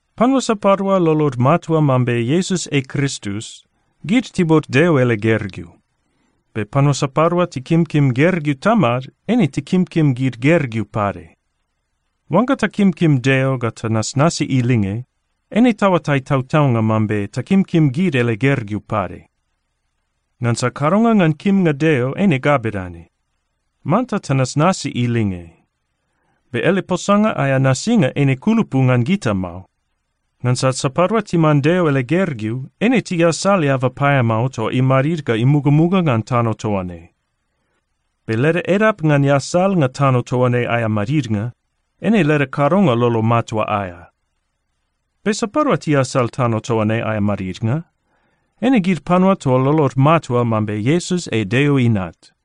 Panua sapadua lolod matua mambe Iesus ei Kristus, gid tiuot Deo ele gergeu. Be panua sapadua tikimkim gergeu tamad, eine tikimkim gid gergeu pade. Oangga takimkim Deo ga tanasnasi ilinge, eine taoatai tautaunga mambe takimkim gid ele gergeu pade. Ngansa kadonga ngan kimnga Deo eine ga bedane: Manta tanasnasi ilinge. Be ele posanga aea nasinga eine kulupu ngan gita mao. Ngansa sapadua timan Deo ele gergeu, eine tiasal eaba paeamao toa imadid ga imugamuga ngan tano toa ne. Be leda edap ngan easalnga tano toa ne aea madidnga, eine leda kadonga lolo matua aea. Be sapadua tiasal tano toa ne aea madidnga? Eine gid panua toa lolod matua mambe Iesus ei Deo Inat.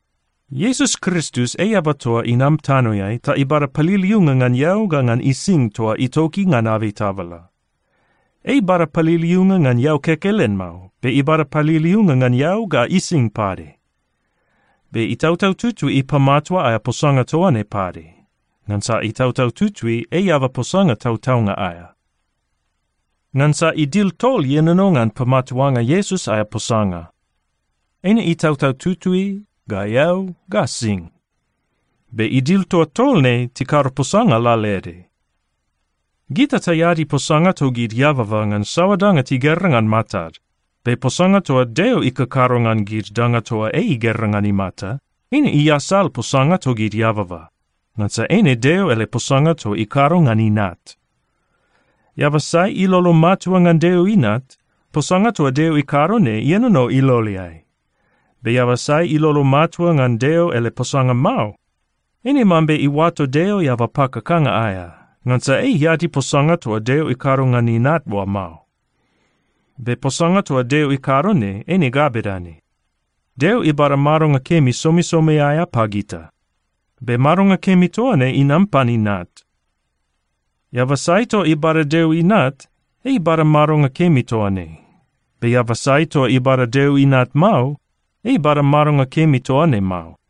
Iesus Kristus ei eaba toa inam tanoeai ta ibada paliliunga ngan eau ga ngan ising toa itoki ngan abei tabala. Ei ibada paliliunga ngan eau kekelen mao. Be ibada paliliunga ngan eau ga ising pade. Be Itautau Tutui ipamatua aea posanga toa ne pade. Ngansa Itautau Tutui ei eaba posanga tautaunga aea. Ngansa idil tol ienono ngan pamatuanga Iesus aea posanga: Eine Itautau Tutui ga eau ga sing. Be idil toa tol ne tikado posanga lalaede. Gita taeadi posanga togid eababa ngan saoa danga tigera ngan matad. Be posanga toa Deo ikakado ngan gid danga toa ei igera ngan imata, eine iasal posanga togid eababa, ngansa eine Deo ele posanga toa ikado ngan Inat. Eaba sai ilolo matua ngan Deo Inat, posanga toa Deo ikado ne ienono iloleai. Be eaba sai ilolo matua ngan Deo ele posanga mao, eine mambe iuato Deo eaba pakakanga aea. Ngansa ei iadi posanga toa Deo ikado ngan Inat oa mao. Be posanga toa Deo ikado ne, eine ga bedane: Deo ibada madonga kemi somisomi aea pagita. Be madonga kemi toa ne inam pan Inat. Eaba sai toa ibada Deo Inat, ei ibada madonga kemi toa ne. Be eaba sai toa ibada Deo Inat mao, ei ibada madonga kemi toa ne mao.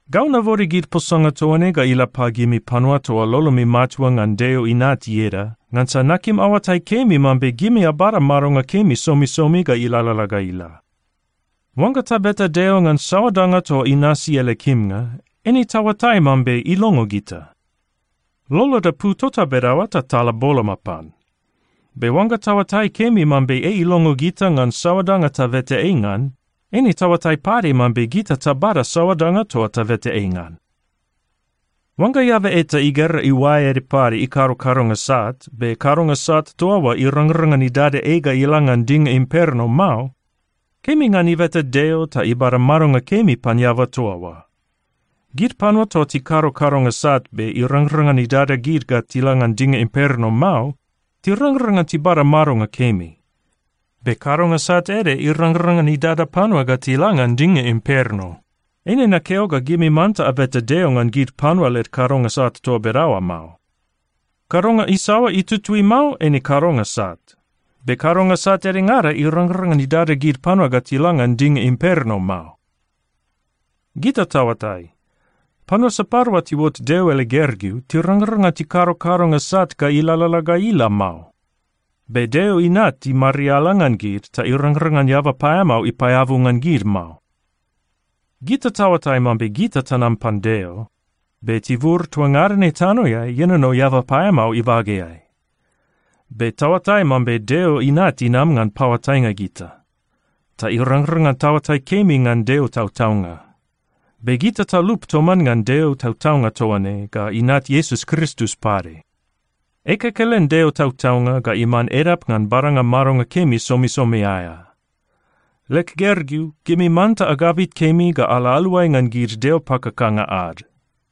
Gau nabode gid posanga toa ne ga ila pagimi panua toa lolomi matua ngan Deo Inat ieda, ngansa nakim aoatai kemi mambe gimi abada madonga kemi somisomi ga ilalala ga ila. Oangga tabeta Deo ngan saoa danga toa inasi ele kimnga, eine taoatai mambe ilongo gita. Loloda pu tota bedaoa ta tala boloma pan. Be oangga taoatai kemi mambe ei ilongo gita ngan saoa danga tabeta ei ngan, eine taoatai pade mambe gita tabada saoa danga toa tabeta ei ngan. Oangga eaba eta igera iuae ede pade ikado kadonga sat, be kadonga sat toa oa irangrang ngan idada ei ga ila ngan dinga imperno mao, kemi ngan ibeta Deo ta ibada madonga kemi pan eaba toa oa. Gid panua toa tikado kadonga sat, be irangrang ngan idada gid ga tila ngan dinga imperno mao, tirangrang ngan tibada madonga kemi. Be kadonga sat ede irangrang ngan idada panua ga tila ngan dinga imperno. Eine nakeo ga gimi manta abeta Deo ngan gid panua led kadonga sat toa bedaoa mao. Kadonga isaoa itutui mao, eine kadonga sat. Be kadonga sat edengada irangrang ngan idada panua ga tila ngan dinga imperno mao. Gita taoatai, panua sapadua tiuot Deo ele gergeu tirangrang ngan tikado kadonga sat ga ilalala ga ila mao. Be Deo Inat imariala ngan gid ta irangrang ngan eaba paeamao ipaeabu ngan gid mao. Gita taoatai mambe gita tanam pan Deo, be tibur toa ngada ne tanoeai ienono eaba paeamao ibageai. Be taoatai mambe Deo Inat inam ngan paoatainga gita, ta irangrang ngan taoatai kemi ngan Deo tautaunga. Be gita talup toman ngan Deo tautaunga toa ne ga Inat Iesus Kristus pade. Ei kekelen Deo tautaunga ga iman edap ngan badanga madonga kemi somisomi aea. Leg gergeu, gimi manta agabit kemi ga ala aluai ngan gid deo pakakanga ad.